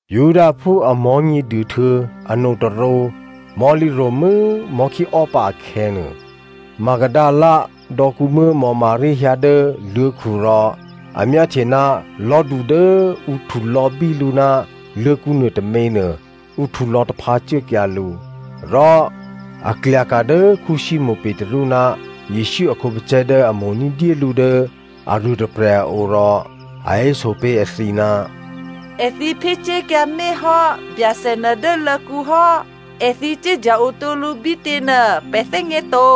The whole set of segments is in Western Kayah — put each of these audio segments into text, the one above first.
Judaphú a Mò̤́nyěduô htuô̌ anotôrǒ mò̤́lǐ ro̤mû́ mò̤́khíò́pǎ akhè̌nuô, Magdalena dò̌kǔmuố̤ Maria hyǎ dố luô̤̌khu rò a myáhtye ná lò̤́du dố ǔ htulò̌bí lǔ ná luô̤̌kǔ nuôtôměnuô ǔ htulò̌taphǎ cuốkyǎ lǔ. Rò a klyaka̤ dố Simonè Petru ná Jesǔ a khǒpacè̤̌ dố a mo̤ ní̤dyé lǔ dố aruôtôprè̤ a o rò a héso pé̤ èthǐ, “Èthǐ phyécuốkyǎmé̤ hò́ Byacè nuô dố luô̤̌kǔ hò́. Èthǐ cuốdya-otǒ lǔ bítě꤮ nuô pè̤ thè́gně to.”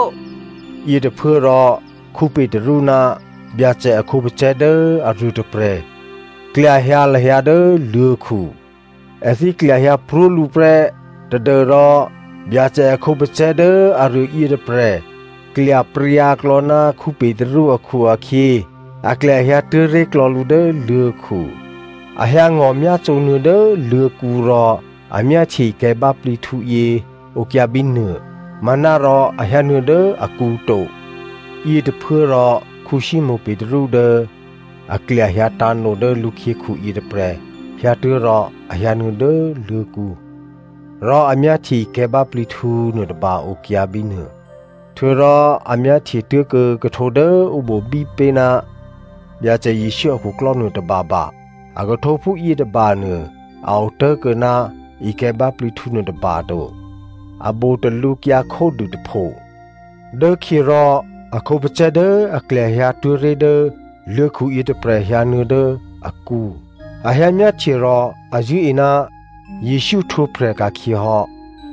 Yětôphuốrò Petru ná Byacè a khǒpacè̤̌ dố aruô tôprè̤ klyahyǎ lahyǎ dố luô̤̌khu. Èthǐ klyahyǎ pró̤ lǔ prè́ tadû́rò Byacè a khǒpacè̤̌ dố aruô yětôprè̤ klyapryǎklò̌ ná Petru akhu-akhyě, a klyahyǎ tuố̤ré̤klò̌ lǔ dố luô̤̌khu. A hyǎ ngò̤myácǒnuô̌ dố luô̤̌kǔ rò a myáhtye ikè̤̌ báplǐhtǔ yě okyǎ bínuô, manárò a hyǎnuô̌ dố akǔ to. Yětôphuốrò Simonè Petru dố a klyahyǎ tǎ̤no dố lǔkhyěkhu yětôprè̤ hyǎtuố̤ rò a hyǎnuô̌ dố luô̤̌kǔ. Rò a myáhtye ikè̤̌ báplǐhtǔ nuôtôba okyǎ bínuô. Htuô̌rò a myáhtye tuố̤kuô̌ khuhtǒ dố ǔ bobí pé̤ ná Byacè Jesǔ akhuklò́ nuôtôbaba. A khuhtǒphú yětôbanuô a otố̤kuô̌ ná ikè̤̌ báplǐhtǔ nuôtôba to. A botalǔ kyǎ khódû tôpho. Dốkhyě rò a khǒpacè̤̌ dố a klyahyǎ tuố̤ré̤ dố luô̤̌khu yětôprè̤ hyǎnuô̌ dố akǔ. A hyǎ myáhtye rò a zṳ̂́e ná Jesǔ htwǒprè̤ ka̤khyě hò́.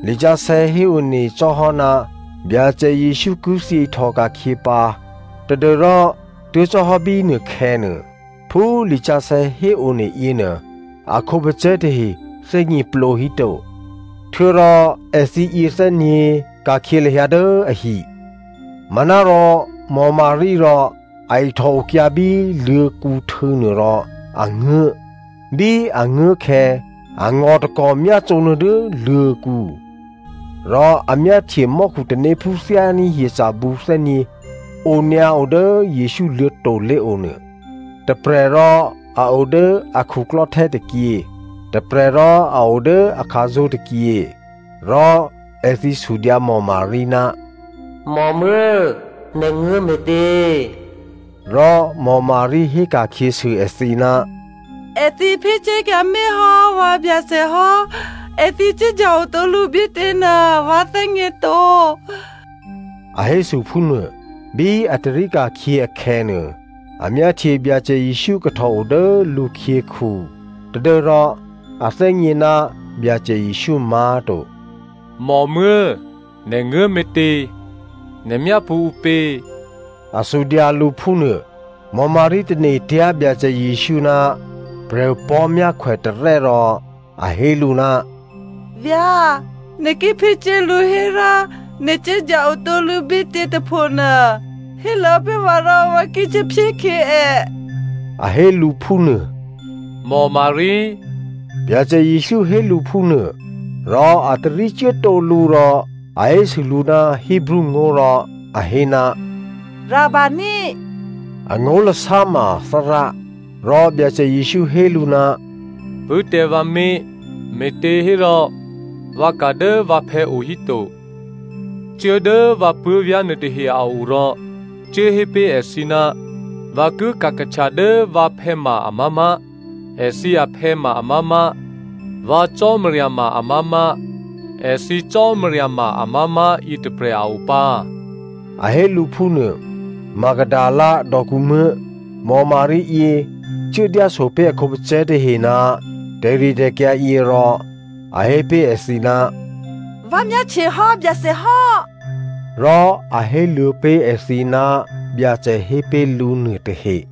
Lisǎsè̌ héone cò́hò́, Byacè Jesǔ ki thyě ihtòka̤khyě pǎ tadû́rò, tuố̤ cò́hò́ bínuôkhè̌nuô, phú lisǎsè̌ héone yěnuô, a khǒpacè̤̌ tahe thè́gněplǒ híto. Htuô̌rò èthǐ yěthè́nyě̤ ka̤khyě lahyǎ dố ahi. Manárò Maria rò a ihtò okyǎ bí luô̤̌kǔhtû̌nuô rò a nguố̤. Bí a nguố̤ khè̌, a ngò̤ takò̤ myácǒnuô̌ dố luô̤̌kǔ. Rò a myáhtye mò́khu tanéphú thyání̤ hyeca̤bǔ thè́nyě̤ onyǎo dố Jesǔ luô̤̌to̤ lé̤o nuô. Tôprè̤ rò a o dố a khuklò́htè́ tôkyě, tôprè̤ rò a o dố a khǎzó̤ tôkyě. Rò èthǐ sudyǎ Maria, “Mòmuố̤, nè̤ nguố̤ me̤tě?” Rò Maria hé ka̤khyěsû èthǐ, “Èthǐ phyécuốkyǎmé̤ hò́ vǎ Byacè hò́, èthǐ cuốdya-o tǒ lǔ bítěnuô vǎ thè́gněto,” a hésû phúnuô. Bí a tarí ka̤khyě akhè̌nuô, a myáhtye Byacè Jesǔ kahtòo dố lǔkhyěkhu tadû́rò a thè́gně ná Byacè Jesǔ má̤to. “Mòmuố̤꤮, nè̤ nguố̤ me̤tě? Nè̤ myápṳ̌ ǔpě?” A sudyǎ lǔ phúnuô. Maria tane̤tyá̤ Byacè Jesǔ ná prè̤opò̤́ myákhwè tarè́ rò a hé lǔ, “Vyá̤, nè̤ ki phyécuố lǔ hérò nè̤ cuốdya-o tǒ lǔ bítě tôphonuô, héluô̌ pé̤ vǎ rò vǎ ki cuốphyékhyě è,” a hé lǔ phúnuô. “Maria,” Byacè Jesǔ hé lǔ phúnuô. Rò a tarí cuốtǒ lǔ rò a hésû lǔ ná Hebreo ngó̤ rò a hé, “Rabboni꤮.” (Angó̤lasá ma Thárá) Rò Byacè Jesǔ hé lǔ, “Pṳ̂́ tǎ vǎ mé̤, me̤těhérò vǎ ka̤ dố vǎphè̌ o híto. Cuố dố vǎ puố̤vyá̤ nuôtahe a o rò cuốhé pé̤ èthǐ, ‘Vǎ ki ka̤kahtya dố vǎphè̌ ma amá̤má̤, thǐ phè̌ ma amá̤má̤, vǎ Cò́marya ma amá̤má̤, thǐ Cò́marya ma amá̤má̤ yětôprè̤ a opǎ’” a hé lǔ phúnuô. Magdalena dò̌kǔmuố̤ Maria yě cuố dyásopé̤ a khǒpacè̤̌ tahe ná tè̤ritè̤kyǎ yě rò a hé pé̤ èthǐ, “Vǎ myáhtyehò́ Byacè hò́!” Rò a héluô̌ pé̤ èthǐ ná Byacè hé pé̤ lǔ nuôtahe.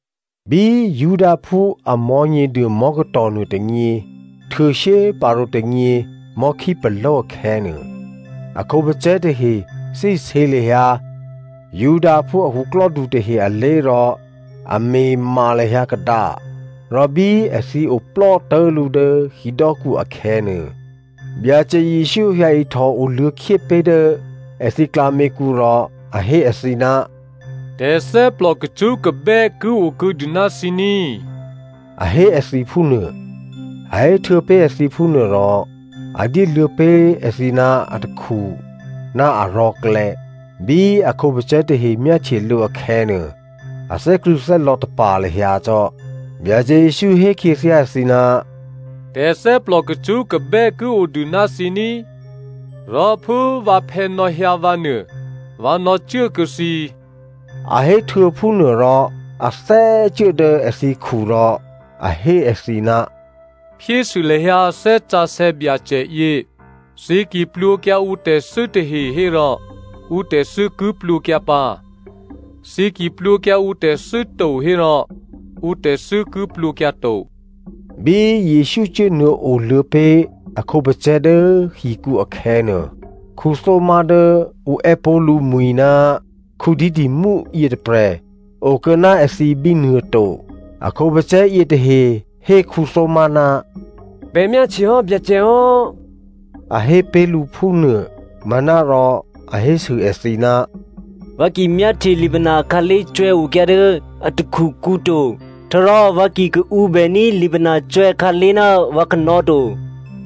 Bí Judaphú a Mò̤́nyěduô mò̤́katò̤ nuôtônyě htuô̌ shyéparǒ tônyě mò̤́khípaló̤ akhè̌nuô, a khǒpacè̤̌ tahe thè́isě lahyǎ Judaphú a khuklò́du tahe alé̤ rò a me̤ma lahyǎ kadǎ, rò bí èthǐ oplò́ tố̤lǔ dố hidò́kǔ akhè̌nuô, Byacè Jesǔ hyǎihtò oluô̌khyé pé̤ dố èthǐ klǎměkǔ rò a hé èthǐ, “Tè̤thè́plò kacṳ́kabè́ ki okuô̌dû ná thǐ ní꤮,” a hé èthǐ phúnuô. A héhtuô̌ pé̤ èthǐ phúnuôrò a dyéluô̌ pé̤ èthǐ ná atakhu ná arò̤̌klè̌. Bí a khǒpacè̤̌ tahe myáhtye lǔ akhè̌nuô, a thè́krṳ̂̌thè́lò̌ tapa̤ lahyǎ cò́. Byacè Jesǔ hé khyěthyá èthǐ, “Tè̤thè́plò kacṳ́kabè́ ki odû ná thǐ ní꤮! Rò phú vǎphè̌ nò̌hyǎ vǎ nuô, vǎ nò̌cuốkuô̌ thǐ.” A héhtuô̌ phúnuôrò a thè́cuố dố èthǐkhu rò a hé èthǐ, “Phyésû lahyǎ Thè́ Sǎsè̌ Byacè yě. Thǐ ki plwǒkyǎ ǔtè̤thû́ tahe hérò ǔtè̤thû́ ki plwǒkyǎ pǎ. Thǐ ki plwǒkyǎ ǔtè̤thû́ to hérò, ǔtè̤thû́ ki plwǒkyǎ to.” Bí Jesǔ cuốnuô̌ oluô̌ pé̤ a khǒpacè̤̌ dố hikǔ akhè̌nuô, Thomazo dố ǔ è́pó̤ lǔmwi̤ ná Didymo yětôprè̤ okuô̌ ná èthǐ bínuô to. A khǒpacè̤̌ yětahe hé Thomazo, “Pè̤ myáhtyehò́ Byacè hò́,” a hé pé̤ lǔ phúnuô. Manárò a hésû èthǐ, “Vǎ ki myáhtye lipana akhǎlé̤ cwè̌okyǎ dố a takhukǔ to, htuô̌rò vǎ ki kaǔbèní̤ lipana cwè̌khǎlé̤ ná vǎ kanò̌ to,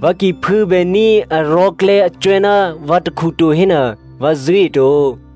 vǎ ki phû̌bèní̤ arò̤̌klè̌ acwè̌ ná vǎ takhu to hénuô, vǎ zṳ̂́eto.”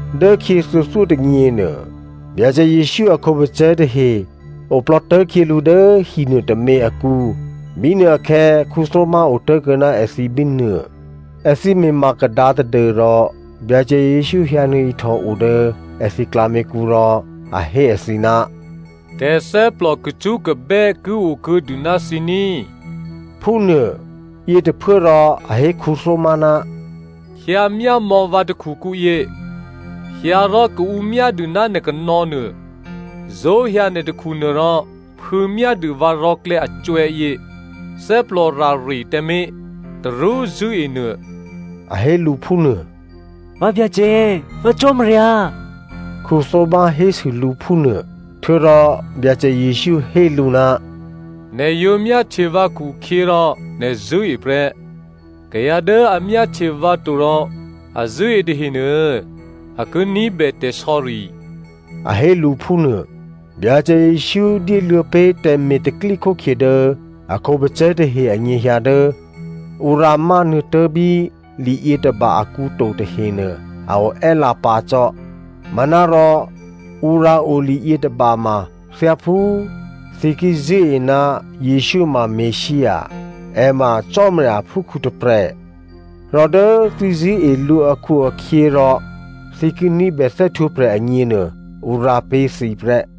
Dốkhyě thuô̌thyótônyěnuô, Byacè Jesǔ a khǒpacè̤̌ tahe oplò́ tố̤khyělǔ dố hinuô tômě akǔ. Bínuôakhè̌ Thomazo otố̤kuô̌ ná èthǐ bínuô. Èthǐ me̤ma kadǎ tadû́rò Byacè Jesǔ hyǎnuô̌ ihtòo dố èthǐ klǎměkǔ rò a hé èthǐ, “Tè̤thè́plò kacṳ́kabè́ ki okuô̌dû ná thǐ ní꤮” phúnuô. Yětôphuốrò a hé Thomazo, “Hyǎmyámò̌ vǎ takhukǔyě, hyǎ rò kaǔmyádû ná nè̤ kanò̌ nuô. Zó̤hyǎ nè̤ takhunuô rò phû̌myádû vǎ rò̤̌klè̌ acwè̌yě. Thè́plò rare tǎmé̤. Tarú zṳ̂́enuô.” A hé lǔ phúnuô. “Vǎ Byacè, vǎ Cò́marya,” Thomazo hésû lǔ phúnuô. Htuô̌rò Byacè Jesǔ hé lǔ, “Nè̤ yǒ myáhtye vǎ khukhyěrò nè̤ zṳ̂́e prè́. Kayǎ dố a myáhtye vǎ to rò a zṳ̂́e tahenuô a ki ní̤bè tè̤sò̌ri,” a hé lǔ phúnuô. Byacè Jesǔ dyéluô̌ pé̤ tè̤me̤ tè̤pro̤tè̤prya̤ dố a khǒpacè̤̌ tahe anyěhyǎ dố ǔ rǎmánuô̌ tố̤ bí li yětôba akǔ to tahenuô a oè́lǎ pǎ cò́. Manárò ǔ rǎo li yětôba ma thyáphú thǐ ki zṳ̂́e ná Jesǔ ma Messia, è ma Cò́marya aphúkhǔ tôprè̤, rò dố thǐ zṳ̂́e lǔ akhu-akhyěrò, thǐ ki ní̤bè thè́htwǒprè̤ agněnuô, ǔ rǎ pé̤ thǐ prè́.